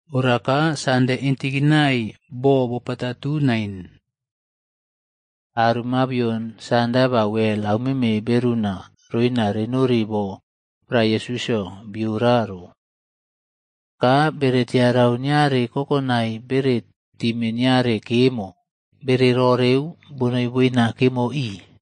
Ora ka Sande intikinai bo bopapatu nain, aro mabion sanda ba wel aumeme beruna roina renori bo prae Yesusꞌyo biora ro. Ka bere tiarau niare kokonai bere time niare kemo, bere roreu bonoi boina kemo ii.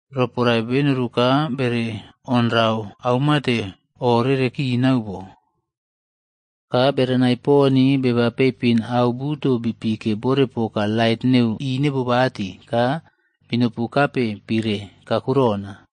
Roporae benoru ka bere onrau aumate o rere kinau bo. Ka berenai poni beba peipin au buto bipike bore poka lait neu inebobati ka binopu kape pire kakurona.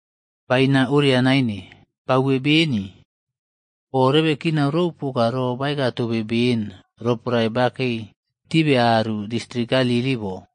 Baina oria naine, bauwe beni. O rebe kinau rou ro poka baeka tobe ben roporae bakei tibe aru distrik Galili bo.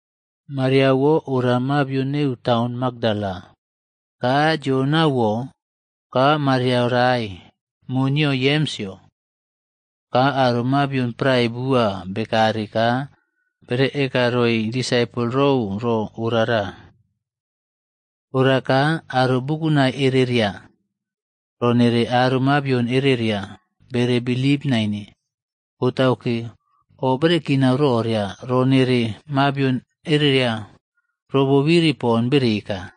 Mariaꞌwo ora mabion neu taun Makdala, ka Joanaꞌwo ka Maria rae, mo nio Yemsꞌyo ka aro mabion prae bua bekare ka bere eka roi disaipol rou ro orara. Ora ka aro bukunai ereria, ro nere aro mabion ereria bere bilip naine. Botauke, o bere kinau roria ro nere mabion ereria ro bobiri pon bere eka.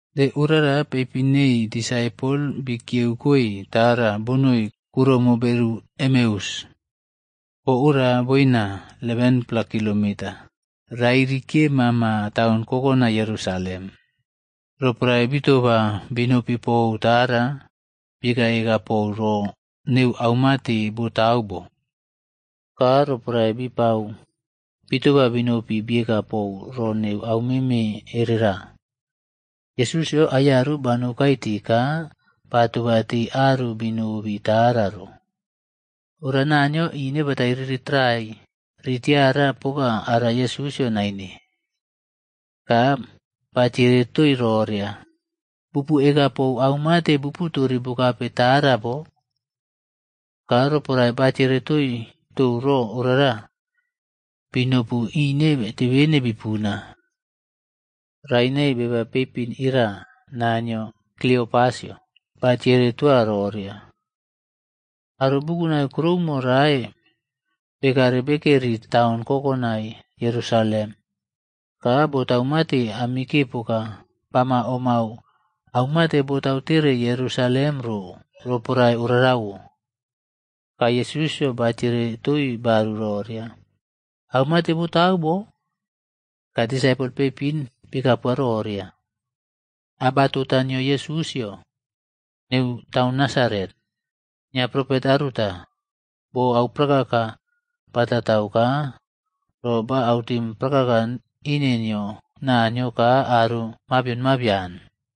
De orara, peipin neii disaipol bikiyeukoe tara bonoi kuroumo beru Emeus. Bo ora boina 11-pla kilometes rairi kiye mama taun kokonai Yerusalem. Ropoae bitoba binopi pou tara, bieka eka pou ro neu aumate botau bo. Ka roporae bipau bitoba binopi bieka pou ro neu aumeme erera, Yesusꞌyo aiyaru banou kai ti ka batoba tii aru binobi tara ro. Ora Naniyo ine batai riri tarai ri tiara poka ara Yesusꞌyo naine. Ka batiere toii roria, “Bupu eka pou aumate bupu tori bukape tara bo?” Ka roporae batiere toii tou ro orara, binopu ineꞌtebene bipuna. Rae nei beba peipin ira naa nio Kliopasꞌyo batiere toa roria, “Aro bukunai kuroumo rae bekare bekeri taun kokonai Yerusalem. Ka botau mate amike poka bama omꞌmau aumate botau tere Yerusalem ro roporae orarawo.” Ka Yesusꞌyo batiere toii baru roria, “Au mate botau bo?” Ka disaipol peipin bieka poa roria, “Abatota nio Yesusꞌyo neu taun Nasaret. Nio propet aruta, bo auprakaka bataꞌtau ka ro ba autim prakaka ine nio Naniyo ka aro mabion mabian.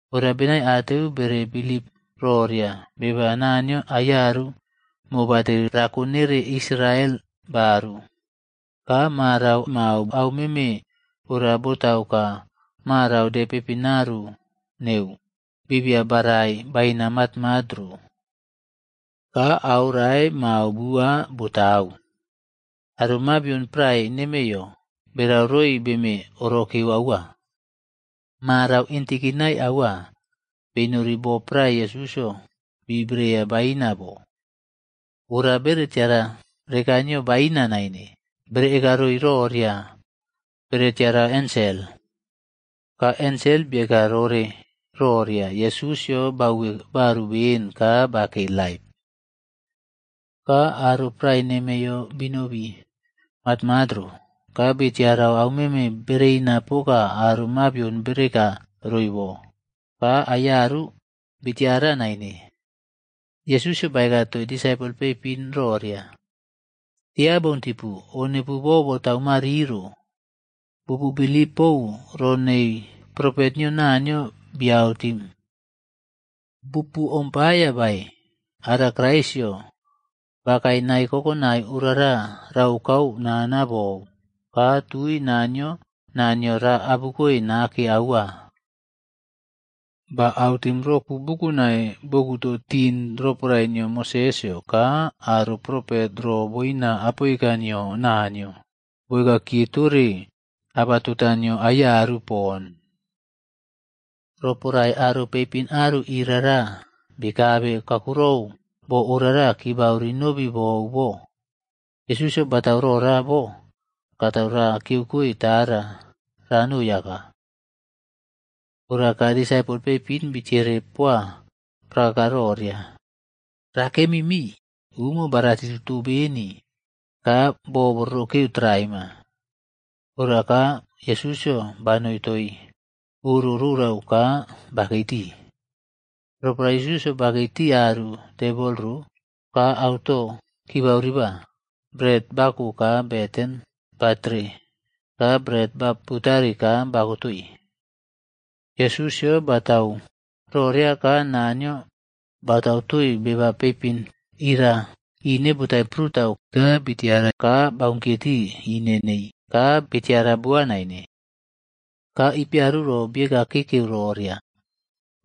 Ora benaiateu bere bilip roria beba Naniyo aiyaru mobateri rako nere Israel baru. Ka marau mao au meme ora botau ka marau de peipin arua neu bibia barai baina matmat ro. Ka au rae mao bua botau, aro mabion prae nemeiyo berau roi beme orokere aua. Marau intikinai aua, benori bo prae Yesusꞌyo bi breya baina bo. Ora bere tiara reka nio baina naine. Bere eka roi roria bere tiarau ensel, ka ensel bieka rore roria Yesusꞌyo bauwokoe baru beni ka bakei laip. Ka aro prae nemeiyo binobi matmat ro, ka bitiarau aumeme bereina poka aro mabion bere eka roi bo. Ka aiyaru, bitiara naine.” Yesusꞌyo baeka toii disaipol peipin roria, “Tia boun tipu. O nepuwo boꞌbotau mariro bupu bilip pou ro nei propet nio Naniyo bi autim. Bupu omꞌpaiya bae ara Kraisꞌyo bakae nae kokonai orara raokau nana bou, ka tui Naniyo naa nio ra abukoe nake aua?” Ba autim roku bukunai bokutu tin roporae nio Mosesꞌyo ka aro propet ro boina apoika nio Naniyo, boeka kiye tore abatota nio aiyaru pon. Roporae aro peipinꞌaru irara bikabe kakurona bo orara kibau rinobi bou bo, Yesusꞌyo batau rora bo katau ra kiyeukoe tara ranoi aka. Ora ka disaipol peipin bitiere poa prakaka roria, “Rakemi mii, umo baꞌratituto beni ka bo bo rorokeu traima.” Ora ka Yesusꞌyo banoi toii oro rorau ka bakei tii. Roporae Yesusꞌyo bakei tii aru tebol ro ka ato kibau riba, bret bako ka beten batere ka bret ba putari ka bako toii. Yesusꞌyo batau roria ka Naniyo batau toii beba peipin ira ine botai prutau ka bii tiara ka baunkiye tii ine nei ka bitiara boa naine. Ka ipiaru ro bieka kekeu roria,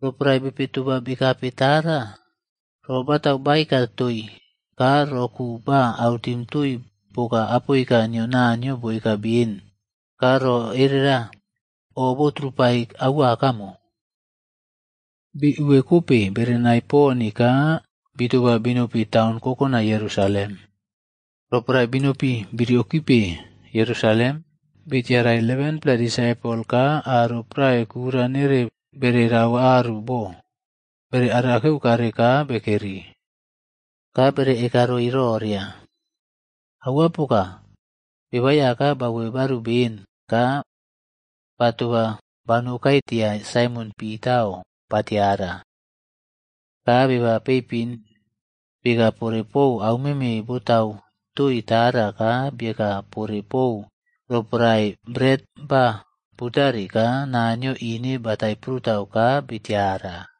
“Roporae bepe toba bekape tara, ro batau baeka toii ka roku ba autim toii poka apoika nio Naniyo boeka beni ka ro erera o botrupai aua kamo.” Bi uwekope berenai poni ka bitoba binopi taun kokonai Yerusalem. Roporae binopi bi riokipe Yerusalem, bitiarai 11-pla disaipol ka aro prae kura nere bere rau aru bo bere arakeu kare ka bekeri. Ka bere eka roi roria, “Aua poka, Beba Aiyaka bauwe baru beni ka batoba banoukai tia Saimon Pitaꞌo batiara.” Ka beba peipin bieka pore pou aumeme botau toii tara ka bieka pore pou roporae bret ba putari ka Naniyo ine batai prutau ka bitiara.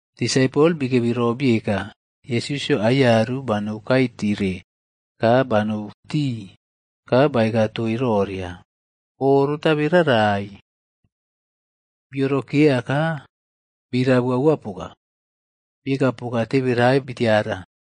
Disaipol bikebi ro bieka, Yesusꞌyo aiyaru banou kai tire ka banou tii ka baeka toii roria, “O rotabe rarai.” Bii orokeya ka birabu aua poka. Bieka poka teberai bitiara.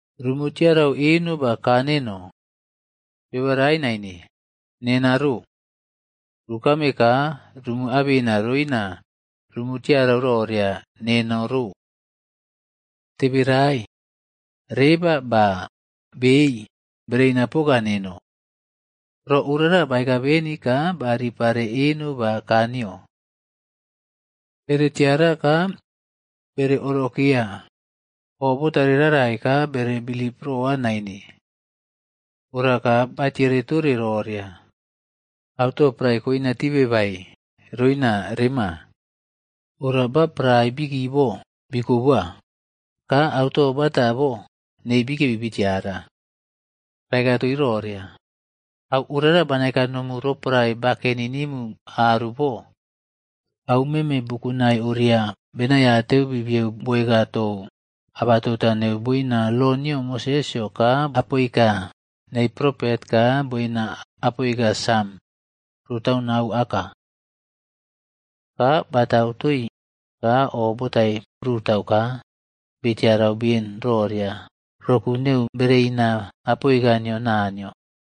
Rumu tiarau eno ba kaa neno. Beba rae naine, nena ro! Rukame ka rumu abena roina rumu tiarau roria neno ro. Teberai, reba ba bei bereina poka neno.” Ro orara baeka beni ka ba ripare eno ba ka nio. Bere tiara ka bere orokeya o botare rarai ka bere bilip roa naine. Ora ka batiere tore roria, “Auto prae koina tibe bae roina rema?” Ora ba prae biki bo bii kobowa, ka auto bata bo neii bikebi bi tiara. Ba eka toii roria, “Au orara bana eka nomu roporae bakeni nimu aru bo. Au meme bukunai oria benaiateu bibiyeu boeka tou abatota neno boina lo nio Mosesꞌyo ka apoika neii propet ka boina Apoika Sam roꞌtaunau aka.” Ka batau toii ka o botai prutau ka bitiarau ben roria roku neu bereina apoika nio Naniyo.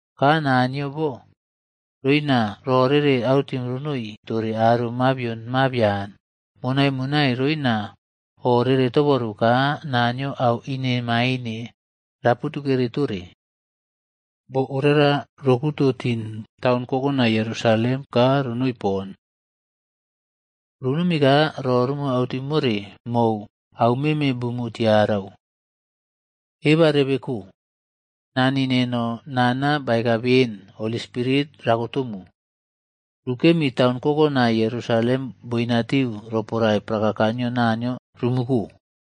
Ka naa nio bo roina ro rere autim ronoi tore aro mabion mabian monaꞌmonai roina o rere toboru ka Naniyo au inemaine raputukere tore. Bo orara ro kuto tin taun kokonai Yerusalem ka ronoi pon. Runomi ka ro rumu autim more mou aumeme bumu tiarau. Eba rebeko. Nani neno nana baeka ben Holi Spirit rakotomu. Rukemi taun kokonai Jerusalem boinatiu roporae prakaka nio Naniyo rumuko.”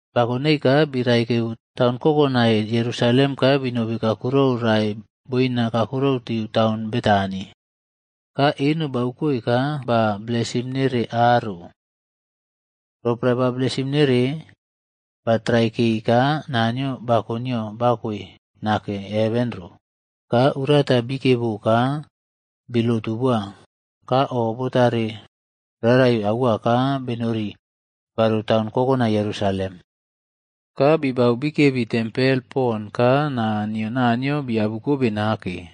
Bako nei ka biraikeu taun kokonai Yerusalem ka binobi kuroumo rae boina kakurona tiu taun Betani, ka eno baukoi ka ba blesim nere aro. Roporae ba blesim nere, ba traikei ka Naniyo bako nio bakoe nake heven ro. Ka urata bikiebo ka bii lotu boa ka o botare rarai aua ka benori baru taun kokonai Yerusalem. Ka bibau bikebi tempel pon ka naa nio Naniyo biabu kobe nake.